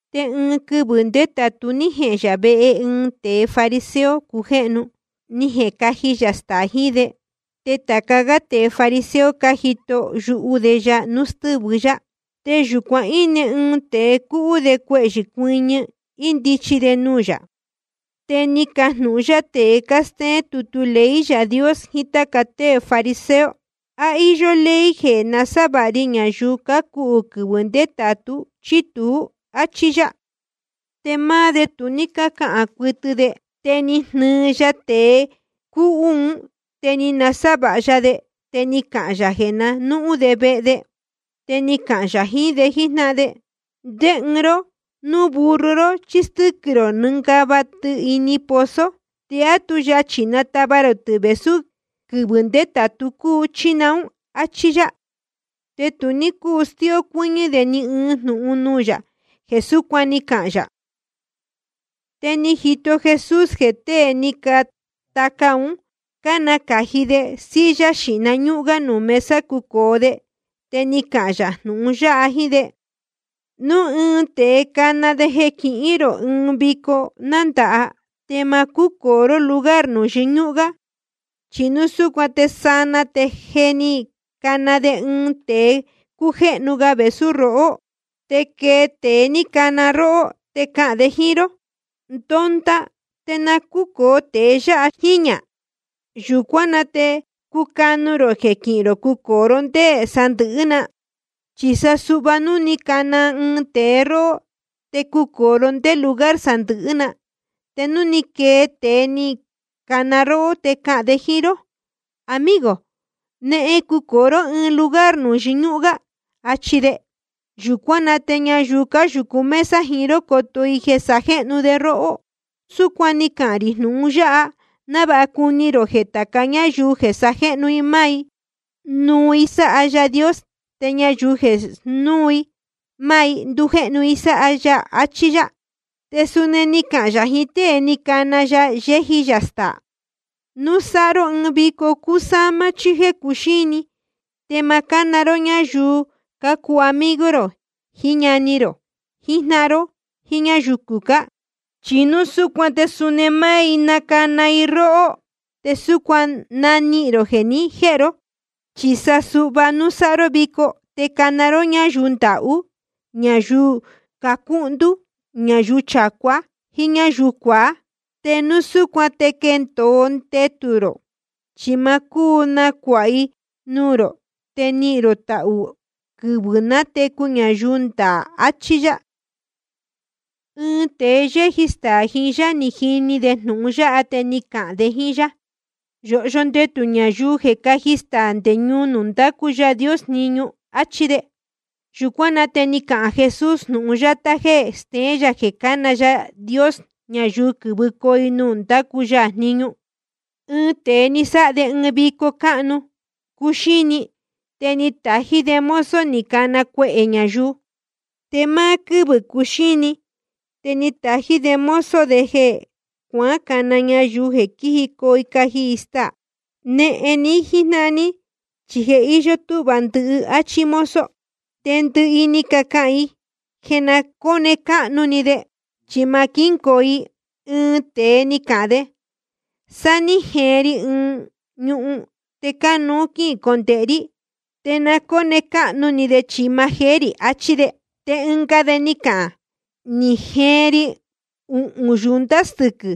Te ɨɨn quɨvɨ̄ ndétātu ní jehēn yā vehe ɨɨn tēe fariseo cujéhnu, ni jecaji yā staā jiín de. Te tāca gá tēe fariseo cájito yuhu de ya núu stɨ́vɨ yá. Te yūcuan íne ɨɨn tēe cúhú de cuehyɨ̄ cuɨñɨ, índichi de nuū yā. Te ni cajnūhun yá tēe cástéén tutu ley Yaā Dios jiín táca tée fariseo: ¿A íyó ley jeē nasávāha ri ñayuu cácuhū quɨvɨ̄ ndétātu, chí tuú? áchí yá. Te máá de tu ní cácahān cuɨtɨ de. Te ni jnɨɨ ya tēe cúhú un, te ni nasávāha ya de, te ni cahān yā jeē na núhun de vehe de. Te ni cahān yā jiín de jíjnáhan de: ¿Ndé ɨɨn róhó núu burro ró chí stɨ́quɨ̄ rō nɨngava tɨ ini pozo, te á tu yachī natava rō tɨ̄ vēsú quɨvɨ̄ ndétātu cúu, chí naún? Achí yá. Te tu ní cúu stíó cuɨ́ñɨ́ de ni ɨɨn jnūhun nuū yā jeē súcuan ni cahān yā. Te ni jito Jesús jeē tée ni cataca ún, cánacāji de silla yɨñúhún gá nuū mesa cucōo de. Te ni cahān yā jnūhun yáha jíín de: Núu ɨɨn tēe cana de jeē quihín rō ɨɨn vico nándāha, te ma cúcōo ró lugar nuū yɨñúhún gá. Chi núu súcuan te sanaa te je ni cana de ɨɨn tēe cújéhnu ga vēsú rohó. Te quee tēe ni cana róhó, te cahān de jíín ró: Ndonda, te na cúcōo tēe yáha jíñā. Yūcuán na te cucanu rō jeē quihín rō cucōo ró ndé sandɨ̄hɨ́ na. Chi sa suhva núu ni cana ɨɨn tēe róhó, te cucōo ró ndé lugar sandɨ̄hɨ́ na. Te núu quee tēe ni cana róhó, te cahān de jíín ró: Amigo, nehen cucōo ró ɨɨn lugar nuū yɨñúhún gá, achi de. Yūcuán na te ñayuu cáyūcu mesa jiín ró coto i jeē sajéhnu de róhó. Súcuan ni cahān rī jnūhun yáha návāha cuni rō jeē tāca ñáyuu jeē sajéhnu i máá i, nuu i sáha Yaā Dios. Te ñayuu jeē snúū i máá i, ndujéhnu i sáha ya. Achí yá. Te suni ni cahān yā jiín tée ni cana ya yéji yā staā: Núu sáha ró ɨɨn vico cúsámá chí jéē cuxíni, te ma cána ró ñáyuu cácuu amigo rō, jiín ñani rō, jiín jnáhan ró, jíín ñáyuu cucá. Chi núu súcuan te suni máá i nacana i róhó, te súcuan nanihīn rō jeē ni jéhe ró. Chi sa suhva núu sáha ró vico, te cana ró ñáyuu ndahú, ñayuu cuhndú, ñayuu chacuá, jíín ñáyuu cuaá. Te súcuan te quendōo ndetū rō, chi ma cúu nacuāha i nuū rō. Te nihīn rō tahū rō quɨvɨ̄ nátecu ñayuu ndaā, achí yá. Te ɨɨn tēe yéji staā jiín yá, ni jini de jnūhun yáha, te ni cahān de jíín yá: Yōhyo ndetū ñayuu jeē cáji staā nde ñuu nuū ndácu Yaā Dios jniñu, áchí de. Yūcuán na te ni cahān Jesús ɨɨn jnūhun yátá jéē steén yā jeē cána Yaā Dios ñayuu quɨ̄vɨcoo i ñuu nuū ndácu ya jniñu: Ɨɨn tēe ni sáha de ɨɨn vico cáhnu cuxíni, te ni tají de mozo ni cana cuehē ñayuu. Te máá quɨ́vɨ̄ cuxíni, te ni tají de mozo de cuacana ñayuu jeē quíjicoo caji staā: Nehen ní jíjnáhan ní, chi je íyó túhva ndɨhɨ, áchí mozo. Te ndɨhɨ i ni cacahān i jeē na cóne cáhnu ni de chi ma quíngoo i. Ɨɨn tēe ni cahān de: Sáá ní jeen ri ɨɨn ñuhun te cánuú quícondēhe rí, te na cóne cáhnu ni de chi ma jeé rī. Achí de. Te ɨnga de ni cahān: Ni jeen ri uhūn yunta stɨquɨ̄,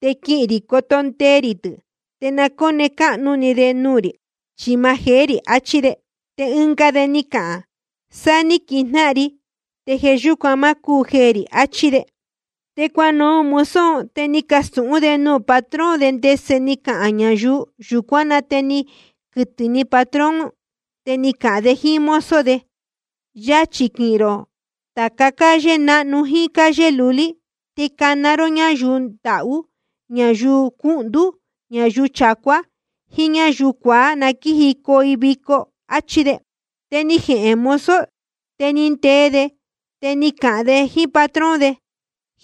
te quihīn rī coto ndee rī tɨ̄, te na cóne cáhnu ni de nuū rī chi ma jeé rī, achí de. Te ɨnga de ni cahān de: Sáá ní quijnáhan ri, te jeē yúcuan ma cúu jeē rī, achí de. Te cuanuhun mozo un, te ni castūhún de nuū patrón de ndese ni cacahān ñayuu. Yūcuán na te ni quɨtɨ̄ ni patrón, te ni cahān de jíín mozo de: Yachī quihīn rō tāca calle náhnu jíín calle lulí, te cana ró ñáyuu ndahú, ñayuu cuhndú, ñayuu chacuá, jíín ñáyuu cuaá, na quíjicoo i vico, áchí de. Te ni jehēn mozo, te ni ndee de, te ni cahān de jíín patrón de: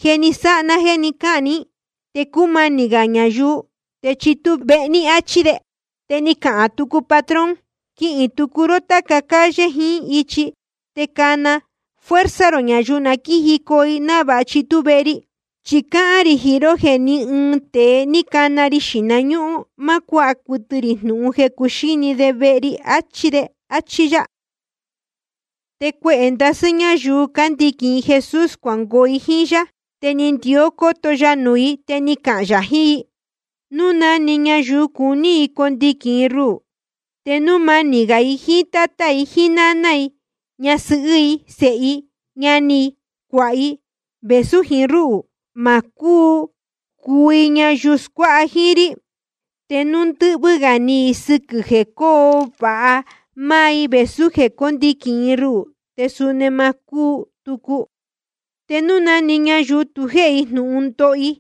Je ni sáha ná jéē ni cáhān ní, te cúmanī gā ñayuu te chitú vehe ní, áchí de. Te ni cahān tucu patrón: Quihīn tucu ró táca calle jiín ichi, te cana fuerza rō ñayuu na quíjicoo i, návāha chitú vehe ri. Chi cáhán rī jiín ró jeē ní ɨɨn tēe ni cana ri xīhna ñúhún, ma cuáha cuɨtɨ rī jnūhun jeē cuxíni de vehe ri, achí de. Achí yá. Te cuehē ndasɨ́ ñáyuu cándiquīn i Jesús cuangoo i jíín yá, te ni ndió cóto ya nuū i, te ni cahān yā jiín i: Núu na‑ni ñayuu cuní condiquīn ruhū, te núu manī gā i jíín tátá i, náná i, ñasɨhɨ́ i, sēhe i, ñani i, cuāha i, vēsú jiín rúhū, ma cúu cuu i ñayuu scuáha jíín rí. Te núu ndɨ́hvɨ́ gā ni i sɨquɨ̄ jeē cóo vāha máá i vēsú jeē cóndiquīn i ruhū, te suni ma cúu tucu. Te na‑ni ñayuu núu tu jéhe i jnūhun ndoho i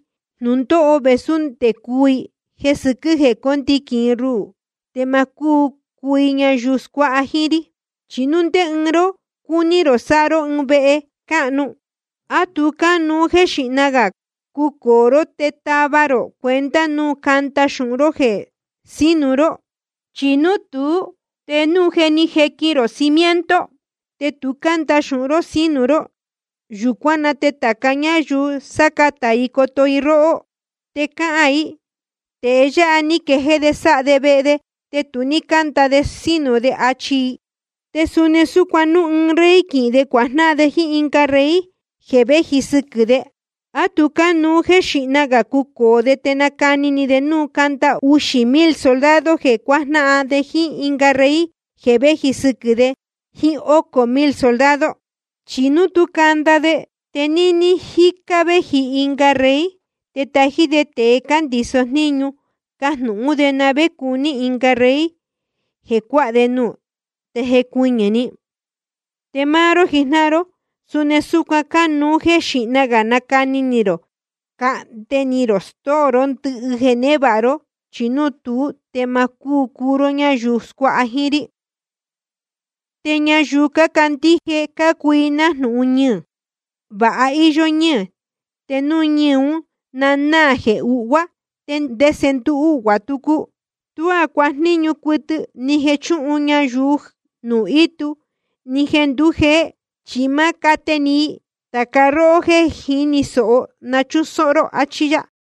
jnūndóho vēsú nde cuu i jeē sɨquɨ́ jeē cóndiquīn i ruhū, te ma cúu cuu i ñayuu scuáha jíín rí. Chi núu ndé ɨɨn ró cúní rō sáha ró ɨɨn vehe cáhnu, ¿á tu cánuú jéē xíhna gā cucōo ró te tava rō cuenta núu canda xūhun jéē sínu ró? Chi núu tuú, te núu je ni jequin rō cimiento, te tu cánda xūhun ró sínu ró, yūcuán na te tāca ñáyuu sácatā i coto i róhó. Te cahān i: Tēe yáha ní quejéé de sáha de vehe, te tu ní cánda de sínu de, achi i. Te suni súcuan núu ɨɨn rey quihīn de cuajnáhan de jíín ɨnga rey jeē véji sɨquɨ̄ de, ¿á tu cánuú jéē xíhna gā cucōo de te nacani ni de núu canda uxī mil soldado jeē cuajnáhan de jíín ɨnga rey jeē véji sɨquɨ̄ de jíín ócō mil soldado? Chi núu tú canda de, te níní jícá gá vēji ɨnga rey, te tají de tēe cándiso jníñu, cajnūhún de na vé cuní ɨnga rey jeē cuáha de nuū, te jecuɨñɨ̄‑ni. Te máá ró jijnáhan ró, suni súcuan cánuú jéē xíhna gā nacani ni rō cahnde ni rō stóo ró ndɨhɨ jeē névāha ró, chi núu tuú te ma cúu cuu ró ñáyuu scuáha jíín rí. ’Te ñayuu cácandíje cácuu i nájnūhun ñɨɨ̄. Vāha íyó ñɨ́ɨ̄, te núu ñɨɨ̄ ún na náā jeē uhvuá, ¿te ndese nduu uhvuā tucu? Tuá cuajníñu cuɨtɨ, ni jeē chúhun ñayuu nuū ítu, ni jeē ndúu jēhen, chi máá cate iī‑ni i. Tāca róhó jéē jíni sōho, na chúsóhó ró. Achí yá.